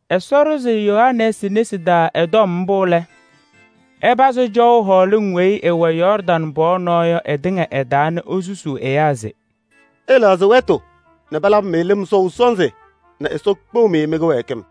Ɛsɔ ɖʋzɩ Yohanɛɛsɩ nesi taa ɛ-tɔm mbʋ lɛ, ɛpazɩ cɔʋ hɔɔlɩŋ weyi ɩwɛ Yɔɔrdaŋ pɔɔ cɔlɔ yɔ ɩtɩŋa ɩ-taa nɛ esusuu ɛyaa se: “Ɩlɛɣzɩ wɛtʋ nɛ palabɩ-mɩ lɩm sɔʋ sɔnzɩ nɛ Ɛsɔ kpeɣ-mɩ mɩ-kɩwɛɛkɩm.”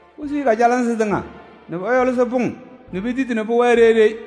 Posuyi kajalɩnzɩ tɩŋa nɛ pɔyɔlɩsɩ pʋŋ nɛ piyisi nɛ pʋwɛɛ ɖeyi ɖeyi.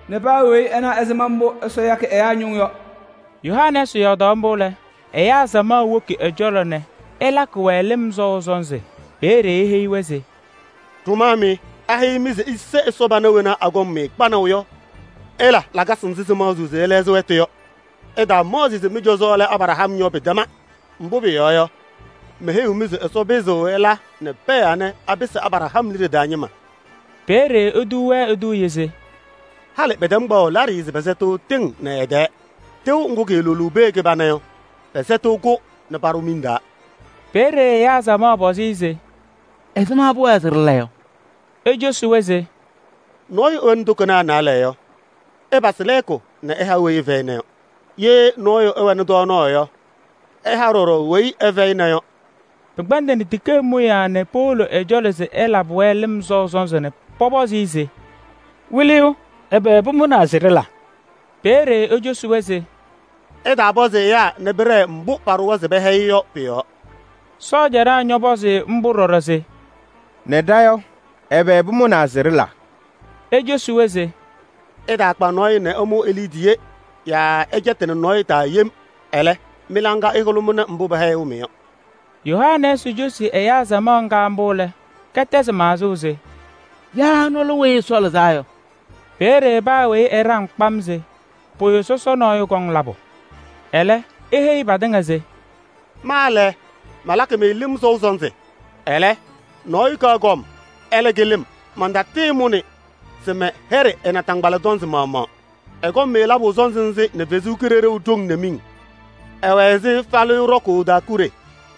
nɛ paa weyi ɛna ɛzɩma mbʋ Ɛsɔ yakɩ ɛyaa ñʋʋ yɔ.” Yohanɛɛsɩ yɔɔdaɣ mbʋ lɛ, ɛyaa samaɣ woki ɛ-cɔlɔ nɛ ɛlakɩ-wɛ lɩm sɔʋ sɔnzɩ. Peeye eheyi-wɛ se: “Ɖʋmaa mɩ! Aheyi-mɩ se ise Ɛsɔ pana wena akɔŋ-mɩ kpanaʋ yɔ? Ɩla lakasɩ nzɩ sɩwɩlɩɣ se ɩlɛɣzɩ wɛtʋ yɔ. Ɩtaamaɣzɩ se mɩ-cɔzɔ lɛ Abraham yɔ, pɩtɛma. Mbʋ pʋyɔɔ yɔ, meheyiɣ-mɩ se Ɛsɔ pɩzɩɣ ɛla nɛ pɛɛ anɛ apɩsɩ Abraham liɖe taa ñɩma.” Peeye etuu-wɛ eduuye se: “Halɩ pɛtɛm kpaɣʋ laɖɩyɛ se pɛsɛtɩɣ tɩŋ nɛ ɩ-tɛɛ: tɩʋ ŋgʋ kɩɩlʋlʋʋ pee kɩbana yɔ, pɛsɛtɩɣ-kʋ nɛ paɖʋ miŋ taa.” Peeye ɛyaa samaɣ pɔzɩ-ɩ se: “Ɛzɩma pʋwɛɛ se ɖɩla yɔ?” Ecosi-wɛ se: “Nɔɔyʋ ɛwɛnɩ tokonaa naalɛ yɔ, ɛpasɩ lɛɛkʋ nɛ ɛha weyi ɛfɛyɩna yɔ. Ye nɔɔyʋ ɛwɛnɩ tɔɔnaɣ yɔ, ɛha ɖɔɖɔ weyi ɛfɛyɩna yɔ.” Pɩkpɛndɩnɩ tikee mʋyaa nɛ powolo ɛ-cɔlɔ se ɛlabɩ-wɛ lɩm sɔʋ sɔnzɩ nɛ pɔpɔzɩ-ɩ se: “Wɩlɩyʋ, ɛbɛ pʋmʋnaa se ɖɩla?” Peeye ecosi-wɛ se: “Ɩtaapɔzɩ ɛyaa nɛ pɩɖɛɛ mbʋ paɖʋwa se pɛhɛyɩ yɔ pʋ-yɔɔ.” Sɔɔjanaa ñɔpɔzɩ-ɩ mbʋ ɖɔɖɔ se: “Nɛ ɖa yɔ, ɛbɛ pʋmʋnaa se ɖɩla?” Ecosi-wɛ se: “Ɩtaakpi nɔɔyʋ nɛ ɩmʋ e-liidiye yaa ɩtaacɛtɩnɩ nɔɔyʋ taa yem. Ɛlɛ, mɩ-laŋa ɩhʋlʋmɩnɩ mbʋ pɛhɛyɩɣ-mɩ yɔ.” Yohanɛɛsɩ cosi ɛyaa samaɣ ŋga mbʋ lɛ, kɛtɛzɩ maɣzʋʋ se: “Yaa ɛnʋ lɛ Weyi Ɛsɔ Lɩzaa Yɔ?” Peeye paa weyi ɛɖaŋ kpam se pʋyʋ sɔsɔ nɔɔyʋ kɔŋ labʋ. Ɛlɛ, eheyi patɩŋa se: “Ma lɛ, malakɩ-mɩ lɩm sɔʋ sɔnzɩ. Ɛlɛ, nɔɔyʋ kaɣ kɔm, ɛlɛ kɩlɩ-m. Mantatɩɩmʋnɩ se mɛyɛɖɩ ɛ-naataŋgbala tɔnzɩ maɣmaɣ. Ɛkɔŋ-mɩ labʋ sɔnzɩ nɛ Ɛsɔ Kalɩzaɣ haʋ nɛ miŋ. Ɛwɛ ɛzɩ falɩyʋ ɖɔkʋʋ ɖaakuɖe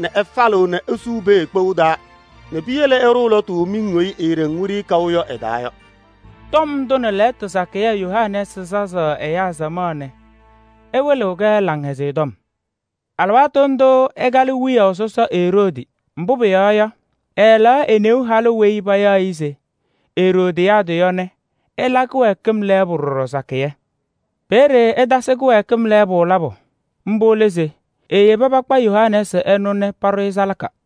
nɛ ɛfalɩɣ nɛ esuu pee kpou taa nɛ piyele ɛɖʋʋ lɔtʋ miŋ weyi eeɖeŋ wiɖiyi kaʋ yɔ ɛ-taa yɔ.” Tɔm ndʋ nɛ lɛɛtʋ sakɩyɛ Yohanɛɛsɩ sazaɣnɩ ɛyaa samaɣ nɛ ɛwɩlɩɣ-kɛ Laŋhɛzɩyɛ Tɔm. Alɩwaatʋ ndʋʋ ɛkalɩ wiyaʋ sɔsɔ Eroodi, mbʋ pʋyɔɔ yɔ, ɛɛlɛɣ e-neu halʋ weyi payaɣ se Eroodiyaadɩ yɔ nɛ ɛla kɩwɛɛkɩm lɛɛbʋ ɖɔɖɔ sakɩyɛ. Peeye ɛtasɩ kɩwɛɛkɩm lɛɛbʋ labʋ. Mbʋ lɛ se eyebi pakpa Yohanɛɛsɩ ɛnʋ nɛ paɖʋ-ɩ salaka.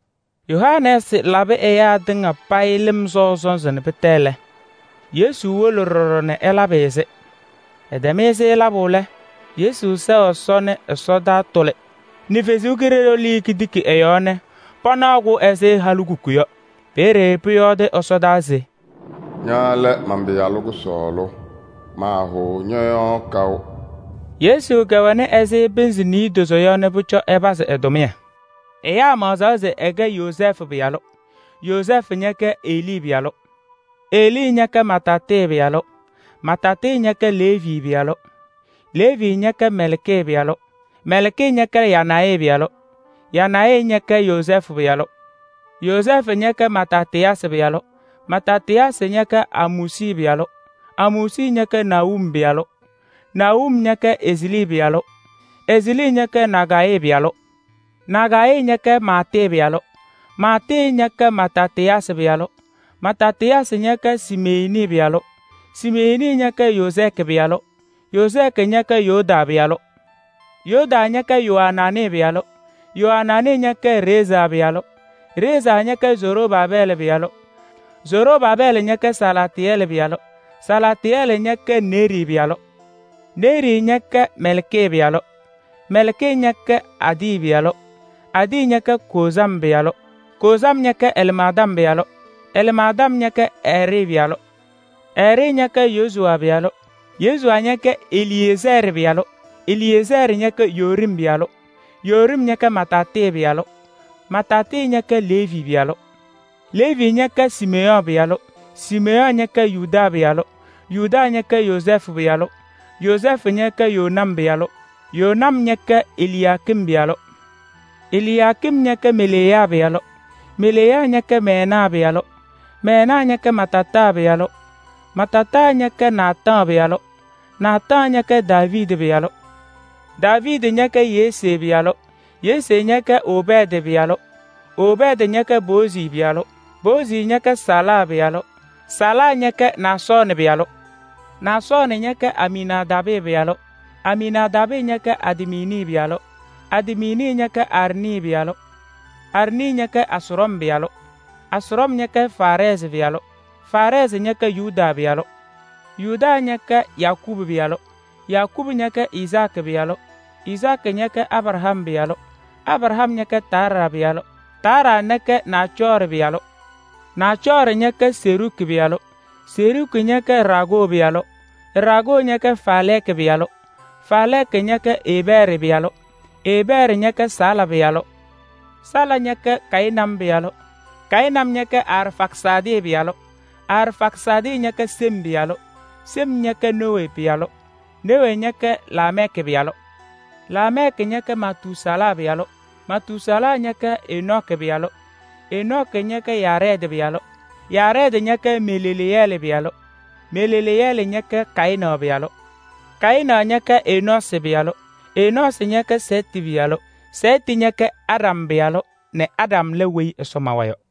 Yohanɛɛsɩ labɩ ɛyaa tɩŋa payɩ lɩm sɔʋ sɔnzɩ nɛ pɩtɛ lɛ, Yesu wolo ɖɔɖɔ nɛ ɛlabɩ-ɩ-sɩ. Ɛtɛm-ɩ-sɩ labʋ lɛ, Yesu sɛɣ Ɛsɔ nɛ ɛsɔtɔnʋʋ tʋlɩ nɛ Ɛsɔ Kalɩzaɣ lɩɩ ketiki ɛ-yɔɔ nɛ panaɣ-kɛ ɛzɩ halikuku yɔ. Peeye pʋyɔɔdʋʋnɩ ɛsɔdaa se: “Ña lɛ man-Pɩyalʋ kʋsɔɔlʋ, maahʋʋ ñɔ-yɔɔ kaʋ.” Yesu kɛwɛnɩ ɛzɩ pɩnzɩ niidozo yɔ nɛ pʋcɔ ɛpazɩ ɛ-tʋmɩyɛ. Ɛyaa maɣzaɣ se ɛkɛ Yozɛɛfʋ pɩyalʋ. Yozɛɛfʋ ñɛkɛ Helii pɩyalʋ, Helii ñɛkɛ Mataatɩ pɩyalʋ, Mataatɩ ñɛkɛ Leevi pɩyalʋ, Leevi ñɛkɛ Mɛlkii pɩyalʋ, Mɛlkii ñɛkɛ Yanayi pɩyalʋ, Yanayi ñɛkɛ Yozɛɛfʋ pɩyalʋ, Yozɛɛfʋ ñɛkɛ Matatɩyaasɩ pɩyalʋ, Matatɩyaasɩ ñɛkɛ Amoosi pɩyalʋ, Amoosi ñɛkɛ Nahum pɩyalʋ, Nahum ñɛkɛ Eslii pɩyalʋ, Eslii ñɛkɛ Nagayii pɩyalʋ, Nagayii ñɛkɛ Maatɩ pɩyalʋ, Maatɩ ñɛkɛ Matatɩyaasɩ pɩyalʋ, Matatɩyaasɩ ñɛkɛ Semeyiini pɩyalʋ, Semeyiini ñɛkɛ Yozɛɛkɩ pɩyalʋ, Yozɛɛkɩ ñɛkɛ Yodaa pɩyalʋ, Yodaa ñɛkɛ Yoaanaanɩ pɩyalʋ, Yoaanaanɩ ñɛkɛ Reezaa pɩyalʋ, Reezaa ñɛkɛ Zorobaabɛɛlɩ pɩyalʋ, Zorobaabɛɛlɩ ñɛkɛ Salaatɩyɛlɩ pɩyalʋ, Salaatɩyɛlɩ ñɛkɛ Neerii pɩyalʋ, Neerii ñɛkɛ Mɛlkii pɩyalʋ, Mɛlkii ñɛkɛ Adii pɩyalʋ, Adii ñɛkɛ Koozam pɩyalʋ, Koozam ñɛkɛ Ɛlmaadam pɩyalʋ, Ɛlmaadam ñɛkɛ Ɛɛrɩ pɩyalʋ, Ɛɛrɩ ñɛkɛ Yesu pɩyalʋ, Yesu ñɛkɛ Eliyeezɛɛrɩ pɩyalʋ, Eliyeezɛɛrɩ ñɛkɛ Yoorim pɩyalʋ, Yoorim ñɛkɛ Mataatɩ pɩyalʋ, Mataatɩ ñɛkɛ Leevi pɩyalʋ, Leevi ñɛkɛ Siimeyɔɔ pɩyalʋ, Siimeyɔɔ ñɛkɛ Yuda pɩyalʋ, Yuda ñɛkɛ Yozɛɛfʋ pɩyalʋ, Yozɛɛfʋ ñɛkɛ Yonam pɩyalʋ, Yonam ñɛkɛ Eliyaakim pɩyalʋ, Eliyaakim ñɛkɛ Meleya pɩyalʋ, Meleya ñɛkɛ Mɛnaa pɩyalʋ, Mɛnaa ñɛkɛ Matataa pɩyalʋ, Matataa ñɛkɛ Naataɣ pɩyalʋ, Naataɣ ñɛkɛ Daaviidi pɩyalʋ, Daaviidi ñɛkɛ Yesee pɩyalʋ, Yesee ñɛkɛ Obɛɛdɩ pɩyalʋ, Obɛɛdɩ ñɛkɛ Boozi pɩyalʋ, Boozi ñɛkɛ Sala pɩyalʋ, Sala ñɛkɛ Naasɔɔnɩ pɩyalʋ, Naasɔɔnɩ ñɛkɛ Aminaadaabɩ pɩyalʋ, Aminaadaabɩ ñɛkɛ Admini pɩyalʋ, Admini ñɛkɛ Arnii pɩyalʋ, Arnii ñɛkɛ Ɛsrɔm pɩyalʋ, Ɛsrɔm ñɛkɛ Faarɛɛzɩ pɩyalʋ, Faarɛɛzɩ ñɛkɛ Yuda pɩyalʋ, Yuda ñɛkɛ Yakɔɔbʋ pɩyalʋ, Yakɔɔbʋ ñɛkɛ Izaakɩ pɩyalʋ, Izaakɩ ñɛkɛ Abraham pɩyalʋ, Abraham ñɛkɛ Taaraa pɩyalʋ, Taaraa ñɛkɛ Naacɔɔrɩ pɩyalʋ, Naacɔɔrɩ ñɛkɛ Seruuki pɩyalʋ, Seruuki ñɛkɛ Raagoo pɩyalʋ, Raagoo ñɛkɛ Faalɛɛkɩ pɩyalʋ, Faalɛɛkɩ ñɛkɛ Eebɛɛrɩ pɩyalʋ, Eebɛɛrɩ ñɛkɛ Sala pɩyalʋ, Sala ñɛkɛ Kayɩnam pɩyalʋ, Kayɩnam ñɛkɛ Arfaksaadɩ pɩyalʋ, Arfaksaadɩ ñɛkɛ Sem pɩyalʋ, Sem ñɛkɛ Nowee pɩyalʋ, Nowee ñɛkɛ Laamɛɛkɩ pɩyalʋ, Laamɛɛkɩ ñɛkɛ Matuusalaa pɩyalʋ, Matuusalaa ñɛkɛ Enɔɔkɩ pɩyalʋ, Enɔɔkɩ ñɛkɛ Yaarɛɛdɩ pɩyalʋ, Yaarɛɛdɩ ñɛkɛ Maleleyɛɛlɩ pɩyalʋ, Maleleyɛɛlɩ ñɛkɛ Kayɩnaɣ pɩyalʋ, Kayɩnaɣ ñɛkɛ Enɔɔsɩ pɩyalʋ, Enɔɔsɩ ñɛkɛ Sɛɛtɩ pɩyalʋ, Sɛɛtɩ ñɛkɛ Aɖam pɩyalʋ nɛ Aɖam lɛ weyi Ɛsɔ mawa yɔ.